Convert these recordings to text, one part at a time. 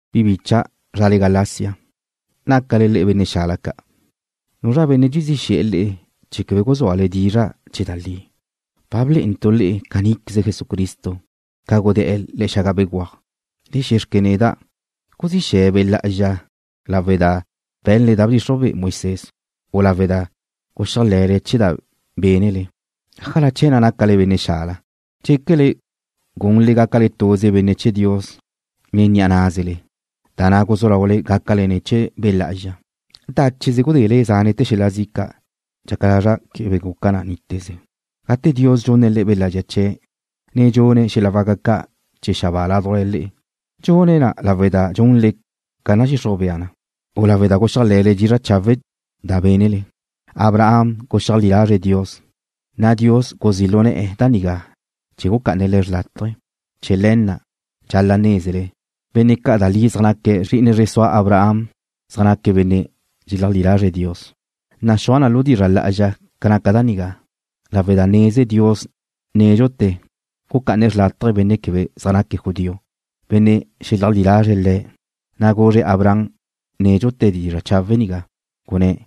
Bi bicha', zrale Galacia, nácale le'e benne' xala ca'. ¿Zua nu benne' dxezí xe̱'e̱ le'e chee̱ québedxa guzúale dizra' chee̱ da li? Ba blé'entu' le'e caníqueze Jesucristo, ca gudé̱'e̱ le̱'e̱ xaga béguaj. Le xe̱xque neda': ¿Guzile Be' Lá'azxa lawe' da be̱nle da bdxixruj be'e Moisés, u lawe' da guxéajle̱le chee̱ da bénnele? ¿Ájala chee̱ na' nácale benne' xala? ¿Dxéquele gunle gácale dute̱ da na' guzú laule gácale ne̱ chee̱ Be' Lá'azxa? ¿Dácheze gudele zánete̱ xel-la zi' ca'? Dxaca lazra' quebe guca na níteze. Gate Dios dxunne̱' le'e Be' Lá'azxa chee̱', ne dxune̱' xel-la waca ca' chee̱ xabáa ládujla le'e, ¿dxune̱' na lawe' da dxunle ca nadxixruj bea na, u lawe' da guxéajle̱le chee̱ dizra' chawe' da bénnele? Abraham guxeajlí lazre̱' Dios, na' Dios guzí' lu ne̱'e̱ da nigá ca tu da bca'ana le̱' xlátaje̱. Chee̱ le̱ na' dxal-la' nézele, benne' ca' da li zaj naque̱' zri'ine zre sua Abraham zaj naque̱' benne' dxeleajlí lazre̱' Dios. Naxúaj na lu dizra' lá'azxa ca naca da nigá. Lawe' da neze Dios nédxute̱ gucá'ane̱' xlátaje̱ benne' quebe zaj naque̱' judío, benne' xeleajlí lazre̱' Le̱', na' guzre̱' Abraham nédxute̱ dizra' chawe' nigá, gunné̱':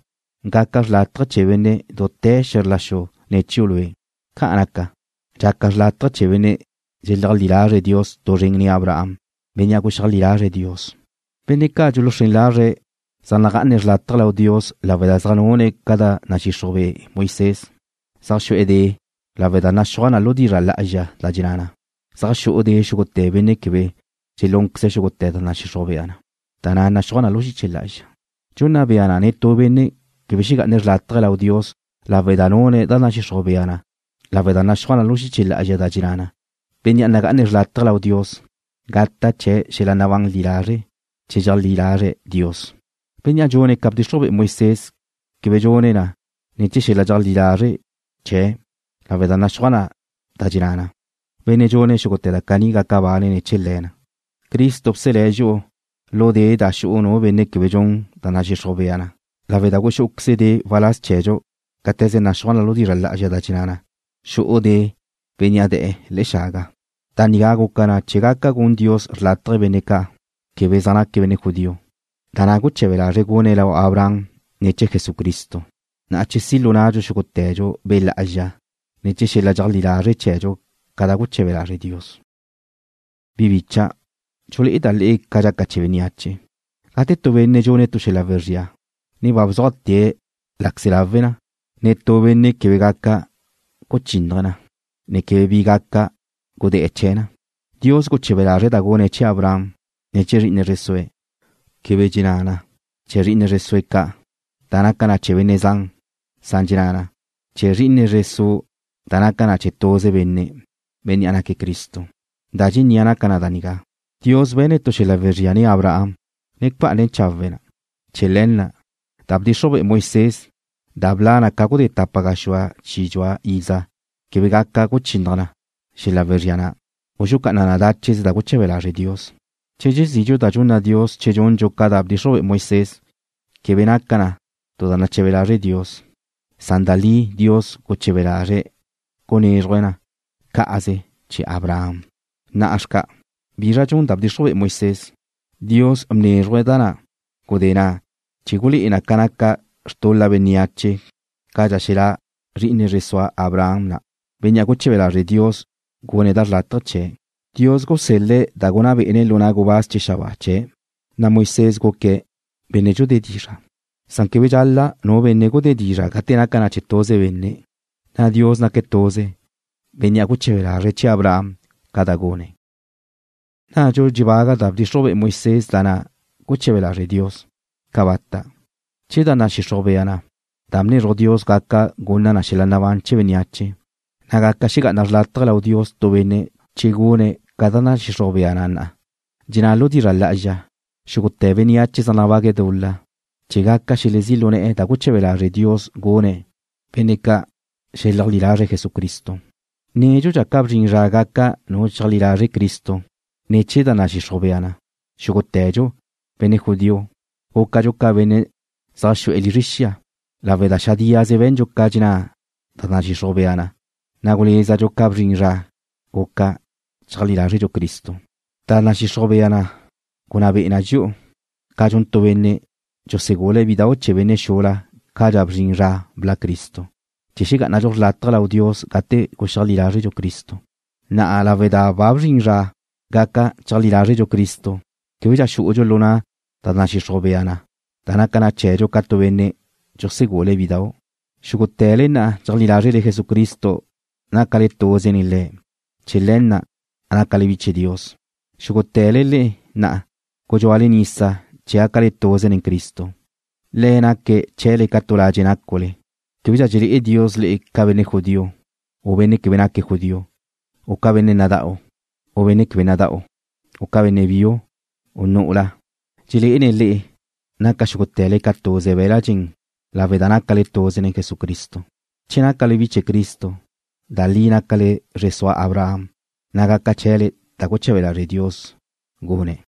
“Gaca chawe' chee̱ benne' dute̱ xe̱zr la xu ne̱ chiu' lue'.” Ca'an naca, dxaca chawe' chee̱ benne' dxeleajlí lazre̱' Dios tu zren nen Abraham, bénnea' guxeajlí lazre̱' Dios. Benne' ca' dxuluxrén lazre̱' zaj nagá'ane̱' xrlátaje lau Dios lawe' da zaj nune̱' ca da nadxixruj be'e Moisés zaj xu'e̱ de' lawe' da naxúaj lu dizra' lá'azxa da dxenná na: Zaj xu'u de' xúgute̱ benne' quebe dxelúnqueze̱' xúgute̱ da nadxixruj bea na, da na' naxúaj na lu xiche lá'azxa. Dxunna bea na netú benne' quebe xegá'ane̱' xrlátaje lau Dios lawe' da nune̱' da nadxixruj bea na lawe' da naxúaj lu xiche lá'azxa da dxenná na: Bénnea' nagá'ane̱' xrlátaje lau Dios gata' chee̱' xel-la nabán li lazre' che dxeajlí lazre̱' Dios. Bénnea' dxune̱' ca bdxixruj be'e Moisés quebe dxune̱' na ne̱ chee̱ xel-la dxeajlí lazre' chee̱' lawe' da naxúaj da dxenná na: Benne' dxune̱' xúgute̱ da caní gaca bane̱' ne̱ chee̱ le̱ na. Cristo bselé̱' dxi'u lu de' da xu'u nu quebe dxun da nadxixruj bea na lawe' da guxú'uqueze̱' de' waláz chee̱dxu cáte̱ze naxúaj lu dizra' lá'azxa da dxenná na: Xu'u de' bénnea' de̱'e̱ le̱'e̱ xaga. Da nigá guca na chee̱ gaca gun Dios xrlátaje benne' ca' quebe zaj naque̱' benne' judío, da na' guche̱be lazre̱' gune̱' lau Abraham ne̱ chee̱ Jesucristo, na' chee̱ si' lu nnadxu xúgute̱dxu Be' Lá'azxa ne̱ chee̱ xel-la dxeajlí lazre' chee̱dxu ca da guche̱be lazre' Dios. Bi bicha', dxulé'eda' le'e ca da dxaca chee̱ bénneache. Gate tu benne' dxune̱' tu xel-la wezría, ne ba bzuajte̱' láqueze̱' lawe na, netú benne' quebe gaca guchínnaje̱' na, ne quebe bi gaca gudé̱'e̱ chee̱ na. Dios guche̱be lazre̱' da gune̱' chee̱ Abraham, ne chee̱ zri'ine zre sue̱'. Quebe dxenná na: Chee̱ zri'ine zre sue̱' ca', da naca na chee̱ benne' zan, san dxenná na: Chee̱ zri'ine zre su', da naca na chee̱ tuze benne', bénnea' naque̱' Cristo. Da dxennia' naca na da nigá: Dios be̱ne̱' tu xel-la wezría nen Abraham, ne bca'ana chawe̱' na. Chee̱ le̱ na', da bdxixruj be'e Moisés da bla' na ca gudé tapa gaxúa chi dxua iza quebe gaca guchinnaj na xel-la wezría na', u xucá'ana na dácheze da guche̱be lazre' Dios. Che dxezidxu da dxunna Dios che dxundxu ca da bdxixruj be'e Moisés, quebe naca na tu da nache̱be lazre' Dios, san da li Dios guche̱be lazre̱' gunézruje̱' na cá'aze chee̱ Abraham. Na'a xca', ¿bizra dxun da bdxixruj be'e Moisés? Dios bnézruje̱' da na' gudé na' chee̱ gulé'e na ca naca xtul-la bénneache cadxa xelá' zri'ine zre sua Abraham na', Bénnea' guche̱be lazre' Dios gune̱' da xrlátaje chee̱'. Dios gusel-le̱' da gunná bé'ene̱' lu na' gubáz chee̱ xabáa chee̱', na' Moisés guque̱' benne' dxudé dizra' chee̱n. Quebe dxun na ba xen nu benne' gudé dizra' gate naca na chee̱ tuze benne', na' Dios naque̱' tuze, Bénnea' guche̱be lazre̱' chee̱ Abraham ca da gune̱'. ¿Nnadxu dxedábaga da bdxixruj be'e Moisés da na' guche̱be lazre' Dios? ¡Cabata'! Che da nadxixruj bea na da bnezruj Dios gaca gunna na xel-la nabán chee̱ bénneache, na' gaca xegá'ana xrlátaje lau Dios tu benne' che gune̱' ca da nadxixruj bea na na'. Dxenná na lu dizra' lá'azxa, xúgute̱ bénneache zaj nabague̱' dul-la chee̱ gaca xelezí' lu ne̱'e̱ da guche̱be lazre' Dios gunne̱' benne' ca' xeleajlí lazre̱' Jesucristo. Nédxudxa ca bzrin zra gaca nu cheajlí lazre̱' Cristo, ne̱ chee̱ da nadxixruj bea na, xúgute̱dxu, benne' judío, gúcadxu ca benne' zaj xu'e̱ lizre xia, lawe' da xadíaze be̱ndxu ca dxenná da nadxixruj bea na, na' gulézadxu ca bzrin zra guca cheajlí lázredxu Cristo. Da nadxixruj bea na gunná be'e na dxi'u, ca dxun tu benne' dxusegule̱' bidau' chee̱ benne' xula cadxa bzrin zra bla' Cristo, chee̱ xegá'anadxu xrlátaje lau Dios gate guxeajlí lázredxu Cristo. Na'a lawe' da ba bzrin zra gaca cheajlí lázredxu Cristo, québedxa xú'udxu lu na' da nadxixruj bea na da naca na chee̱dxu ca tu benne' dxusegule̱' bidau'. Xúgute̱le na' dxeajlí lázrele Jesucristo nácale tuze nen Le̱'. Chee̱ le̱ na' nácale bi chee̱ Dios. Xúgute̱le le'e na' gudxúale nisa chee̱ gácale tuze nen Cristo, Le̱' naque̱' chee̱le ca tu ladxe' nácule. Québedxa dxelé'e Dios le'e ca benne' judío, u benne' quebe naque̱' judío, u ca benne' nada'u, u benne' quebe nada'u, u ca benne' biu, u nu'ula. Dxelé'ene̱' le'e, naca xúgute̱le ca tuze be̱l-la' dxen lawe' da nácale tuze nen Jesucristo. Che nácale bi chee̱ Cristo, da li nácale zre sua Abraham, na' gaca chee̱le da guche̱be lazre' Dios gune̱'.